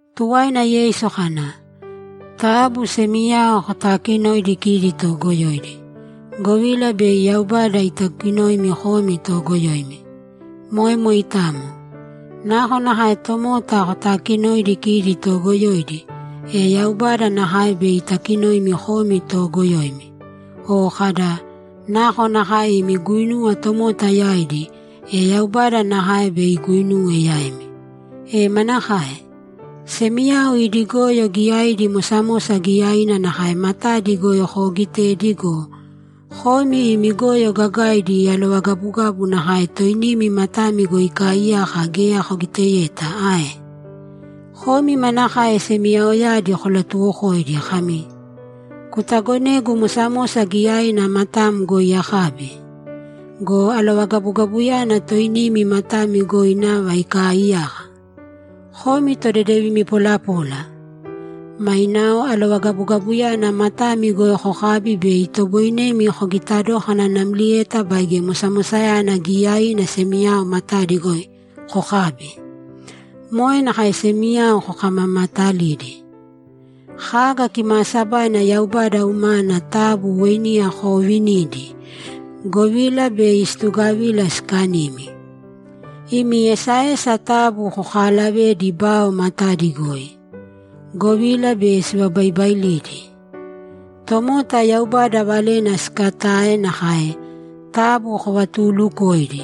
Tuwaina Yeisu kana, ‘Taabu semiyao kotaakinōidi kidi toogoyoidi, govila bei Yaubada itakinoimi komi toogoyoimi. Moe moitamo. Nakonakae tomota kotakinoidi kidi toogoyoidi, e Yaubada nakae bei itakinoimi komi toogoyoimi. O kada, “Nakonakae imi guinuwa tomota yaidi, e Yaubada nakae bei iguinuwe yaimi.” E manakae? Semiyao idi goyo giyaidi mosamosa giyaina nakae matadi goi koogitedi go, komi imi goyo gagaidi alovagabugabu nakae toinimi matami goi ikaaiyaka geya kogiteyeta ae? Komi manakae semiyaoyadi kolatuwokoidi kami, “Kutagonēgu mosamosa giyaina matam goi akabi”? Go alovagabugabuyana toinimi matami goi nava ikaaiyaka! Komi todedevimi polapola! Mainao alovagabugabuyana matami goi kokābi bei itoboinemi kogita dókana namlieta baige mosamosayana giyaiina semiyao matadi goi kokābi. Moe nakae semiyao kokamamaetalidi. Kaga kimaasabaina Yaubada umana taabu weiniya koovinīdi, govila bei situgavila sikanimi. Imi esaesa taabu koolavēdi bao matadi goi, govila bei sivabaibailidi. Tomota Yaubada valena sikatae nakae; taabu kovatuulukōidi,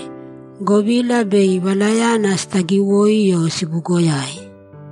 govila bei valayana sitagiwoi o sibugoyaimi.’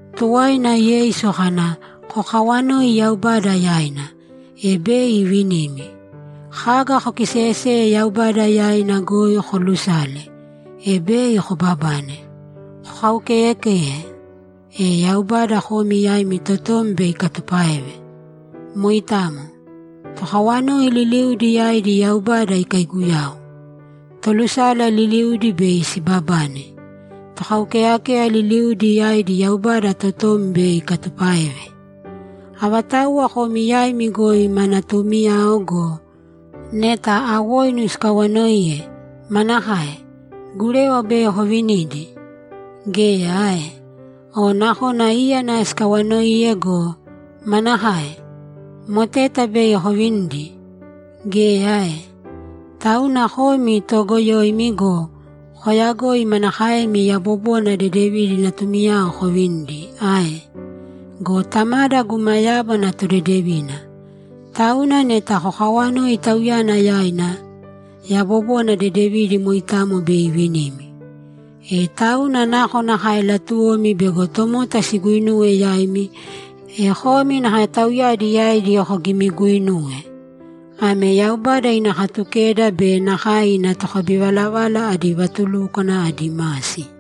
Tuwaina Yeisu kana, ‘Kokawanōi Yaubada yaina, e bei ivinimi. Kaga kokiseeyeseye Yaubada yaina goi koolusāle, e bei kobabane. Kokaukeeyakēya, e Yaubada komi yaimi totom bei ikatupáeve. Moitamo. Tokawanoi liliudi yaidi Yaubada ikaiguyau. Tolusala liliudi bei sibabane. Tokaukeyakeya liliudi yaidi Yaubada totom bei ikatupáeve. Avatauwa komi yaimi goi ma natuumiyao go, neta awoinu sikawanoiye, manakae? Gurewa bei kovinidi? Geya ae? O nakona íyana sikawanoiye go, manakae? Moteta bei kovinidi? Geya ae? Tauna komi toogoyoimi go, koyagoi manakaemi yabobona dedevidi natumiyao kovinidi ae? Go Tamada guma yábana todedevina, tauna neta kokawanoi Tauyana yaina, yabobona dedevidi moitamo bei ivinimi. E tauna nakonakae latuwomi bego tomota siguinuwe yaimi, e komi nakae tauyadi yaidi kogimiguinūwe. Ame Yaubada ina Katukeda be nakae ina tokabivalavala adi vatulúkwana adi masi.’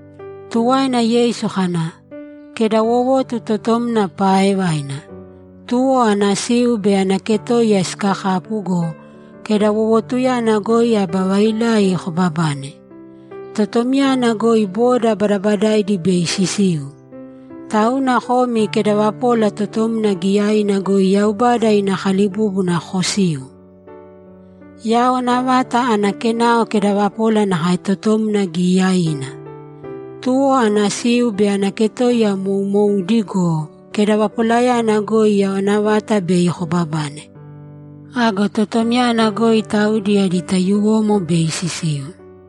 Tuwaina Yeisu kana, ‘Kedawowotu totomna paaevaina. Tuwo ana siu be ana ketoiya sikakapu go, kedawowotuyana goi aba vailai kobabane. Totomyana goi boda badabadaidi bei sisiu. Tauna komi kedavapola totomna giyaina goi Yaubada ina kalibúbuna kosīu. Yawana vata ana kenao kedavapola nakae totomna giyaiina. Tuwo ana siu be ana ketoiya moumoudi go, kedavapolayana goi yawana vata bei kobabane. Ago totomyana goi taudi adi taiyuwomo bei sisiu.’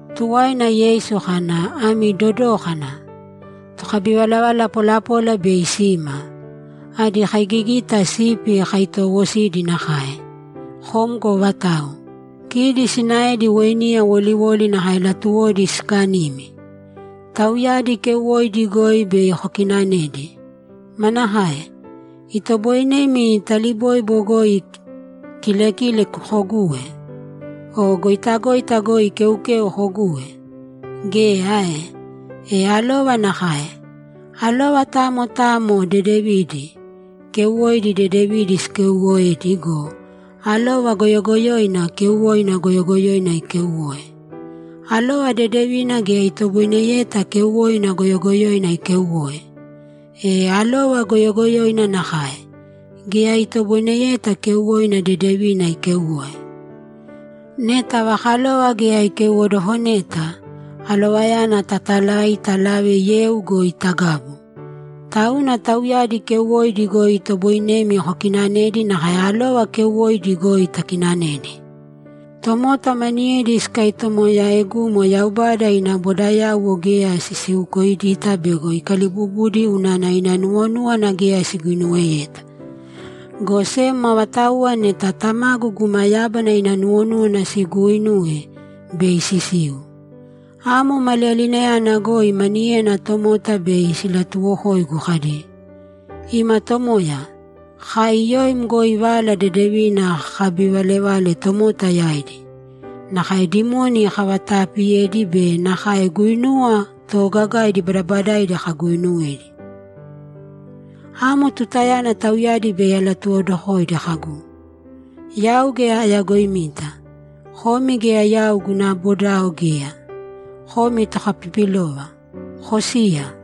Tuwaina Yeisu kana, ‘Ami dodōkana! Tokabivalavala polapola bei sima; adi kaigigita sipi kaitoowosidi nakae. Kom go vatau? Kidi sinaedi weiniya woliwoli nakae latuwodi sikanimi! Tauyadi keuwoidi goi bei kokinanedi. Manakae? Itoboinemi taliboibo goi kilekile koguwe? O goitagoita goi keukeu koguwe? Geya ae? E alova nakae. Alova tamo tamo dedevidi, keuwoidi dedevidi sikeuwoedi go, alova goyogoyoina keuwoina goyogoyoina ikeuwoe. Alova dedevina geya itoboineyeta keuwoina goyogoyoina ikeuwoe. E alova goyogoyoina nakae, geya itoboineyeta keuwoina dedevina ikeuwoe. Neta ava kalova geya ikeuwodokoneta, alovayana tatalai talave yeu goi tagabu. Tauna tauyadi keuwoidi goi itoboinemi kokinanedi nakae alova keuwoidi goi takinanedi. Tomota maniyedi sikatomooyaegumo Yaubada ina bodayauwo geya sisiukoidita bego ikalibubudi unana ina nuwonúwana geya siguinuweyeta. Go sem avatauwa neta Tamagu guma yábana ina nuwonúwana siguuinuwe, bei sisiu. Amo maliyalinayana goi maniyena tomota bei silatuwokoigu kadi, “Ima Tomoya, kai yoim goi Vala Dedevina kakabivalevale tomota yaidi, nakae dimoni kavataapiyedi be nakae guinuwa toogagaidi badabadaidi kaguuinuwedi.” Amo tutayana tauyadi bei alatuwokodokoidi kagu, “Yau geya ayagoimita; komi geya yau guna bodao geya. Komi tokapipilova, kosīya!”’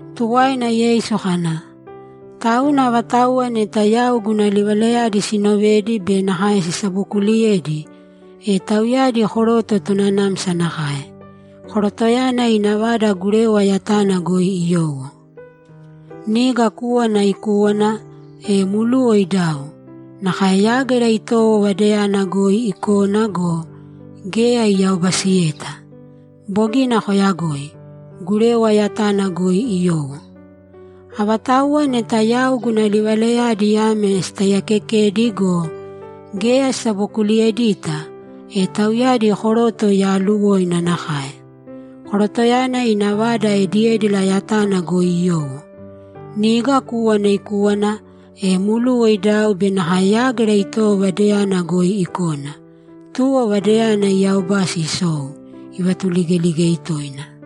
Tuwaina Yeisu kana, ‘Tauna avatauwa neta yau guna livalayadi sinovedi be nakae sisabokuuliyedi, e tauyadi koroto tonanamsa nakae. Korotoyana ina vada gurewa yatana goi iyowo. Niga kúwana ikúwana, e mluwa idau, nakae yágira itowo vadayana goi ikona go, geya iyaobasiyeta. Bogina koyagoi. Gurewa yatana goi iyowo. Avatauwa neta yau guna livalayadi ame sitaiyakekedi go, geya sisabokuliyedita, e tauyadi koroto yaaluwoina nakae. Korotoyana ina vada ediédila yatana goi iyowo. Niga kúwana ikúwana, e mluwa idau be nakae yágira itowo vadayana goi ikona, tuwo vadayana iyaobasi isou, ivatuligeligei toina.’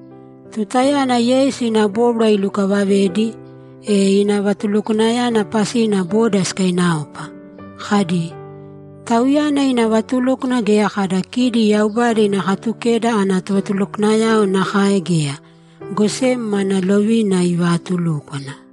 Tutayana Yeisu ina bóbwara ilukavavedi, e ina vatulukwanayana pasina boda sikainaopa, kadi, ‘Tauyana ina vatulúkwana geya kada kidi Yaubada ina Katukeda ana tovatulukwanayao nakae geya, go sem mana lovina ivaatulúkwana.’